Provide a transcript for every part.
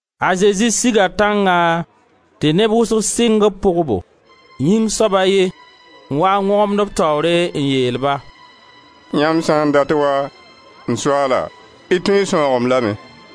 A Zezi siga tãngã tɩ neb wʋsg sɩng b pʋgbo. Yĩng soab a ye n waa n wõgemd b taoore n yeel-ba: «Yãmb sã n dat waa, m Soaala, y tõe n sãoog-m lame.»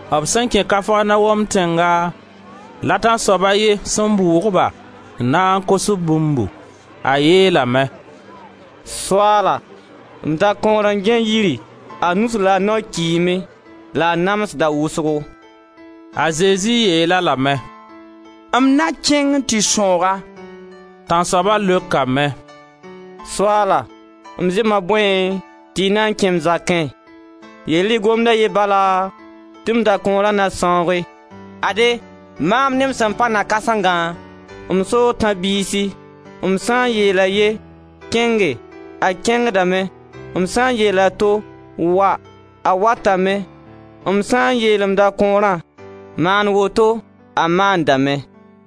B sẽn kẽ Kafarnaom tẽnga la tãnsoab a ye sẽn bʋʋg-ba n na n kos-b bũmbu. A yeelame: «Soaala, m dakõor n gãe yiri, a nus la a nao kiime la a namsda wʋsgo.» A Zezi yeel-a lame: «M na kẽng n tɩ sãoog-a!» Tãnsoaba leokame: «Soaala, m zema bõe tɩ y na n kẽ m zakẽ? Yeel-y gomd a ye bala tɩ m dakõora na sãooge. Ade, maam ne m sẽn pa na-kãsengã, m soo tãb-biisi, m sã n yeel a ye: kẽnge! A kẽngdame, m sã n yeel a to: wa! A watame; m sã n yeel m dakõorã: maan woto! A maandame.»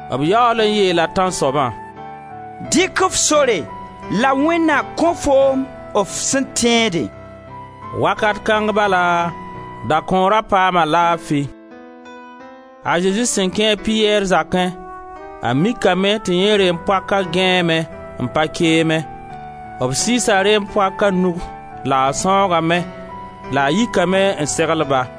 B yaool n yeela tãnsoabã: «Dɩk f sore, la Wẽnd na kõ foom f sẽn tẽede.» Wakat kãng bala dakõora paama laafi. A Zezi sẽn kẽ a Piyɛr zakẽ, a mikame tɩ yẽ reem-poak gãeeme n pa keemẽ. B sɩɩsa reem-poaka nug la a sãoogame la a yikame n segl-ba.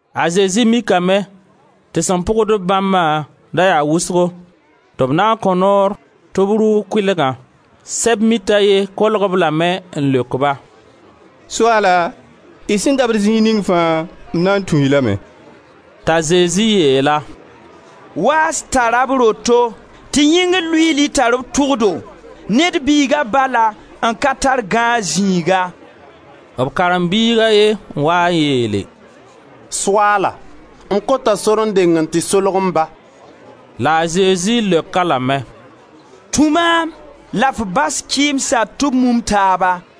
A Zezi mikame tɩ sẽn pʋgd-b bãmbã da yaa wʋsgo tɩ b na n kõ noor tɩ b rʋʋg kʋɩlgã. Sɛb-mit a ye kolg-b lame n leok-ba: «Soaala, y sẽn dabd zĩig ning fãa m na tũ-y lame.» T'a Zezi yeel-a: «Waas tara b roto, tɩ yĩngr luiili tar b tʋgdo; Ned Biiga bala n ka tar gãag zĩiga.» B karen-biig a ye n waa n yeele: «Soaala, m kota sor n deng n tɩ solg m ba.» La a Zezi leok-a lame: «Tũ maam la f bas kɩɩmsa ti b mum taaba.»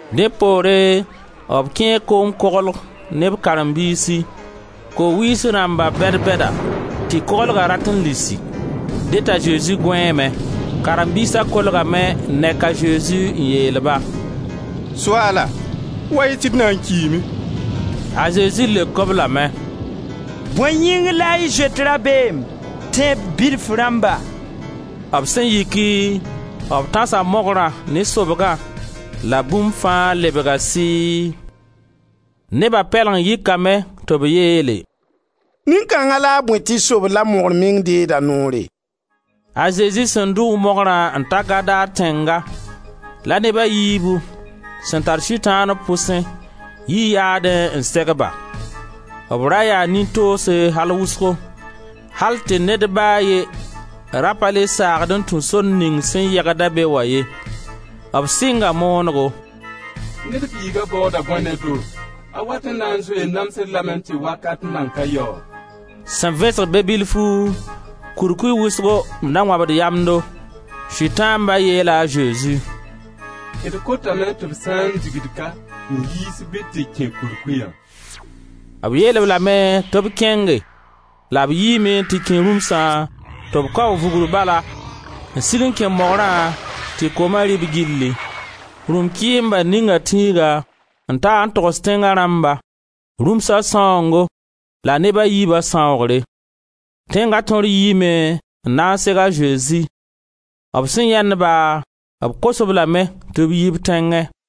Dẽ poore b kẽe koom koglg ne b karen-biisi. Ko-wiis rãmba bɛd-bɛda tɩ koglga rat n lisi. Dẽ t'a Zezi gõeeme. Karen-biisa kolgame n nek a Zezi n yeel-ba: «Soaala, wa-y tɩ d na n kiime!» A Zezi leok-b lame: «Bõe yĩng la y zoet dabeem, tẽeb bilf rãmba?» B sẽn yiki, b tãsa mogrã ne sobgã la bũmb fãa lebga sɩɩ. Neba pɛleng yɩkame tɩ b yeele: «Nin-kãnga la a bõe tɩ sobd la mogr meng deegd a noore?» A Zezi sẽn dʋʋg mogrã n ta Gadar tẽnga la neb a yiibu, sẽn tar Sʋtãan b pʋsẽ, yi yaadẽ n seg-ba. B ra yaa nin-toose al wʋsgo, al tɩ ned ba a ye ra pa le saagd n tũ sor ning sẽn yegd-a be wã ye. B sɩnga moonego: «Wẽnd Biiga baooda bõe ne-do? A wat n na n zoe n nams-d lame tɩ wakat nan ka yao?» Sẽn vẽsg be bilfu, kurkuy wʋsgo n da wãbd yamdo. Sʋtãamba yeela a Zezi: «D kotame tɩ f sã n dig-d ka n yiis bɩ d tɩ kẽ kurkuya!» B yeel-b lame tɩ b kẽnge la b yiime n tɩ kẽ rũmsã tɩ b kaoog vugr bala n sig n kẽ mogrã tɩ kooma rɩ-b gilli. Rũm-kɩɩmba ninga tĩiga n ta n togs tẽnga rãmba rũmsa sãoongo la neb a yiiba sãoogre. Tẽnga tõr yiime n na n seg a Zezi; b sẽn yãend-ba, b kos-b lame tɩ b yi b tẽngẽ.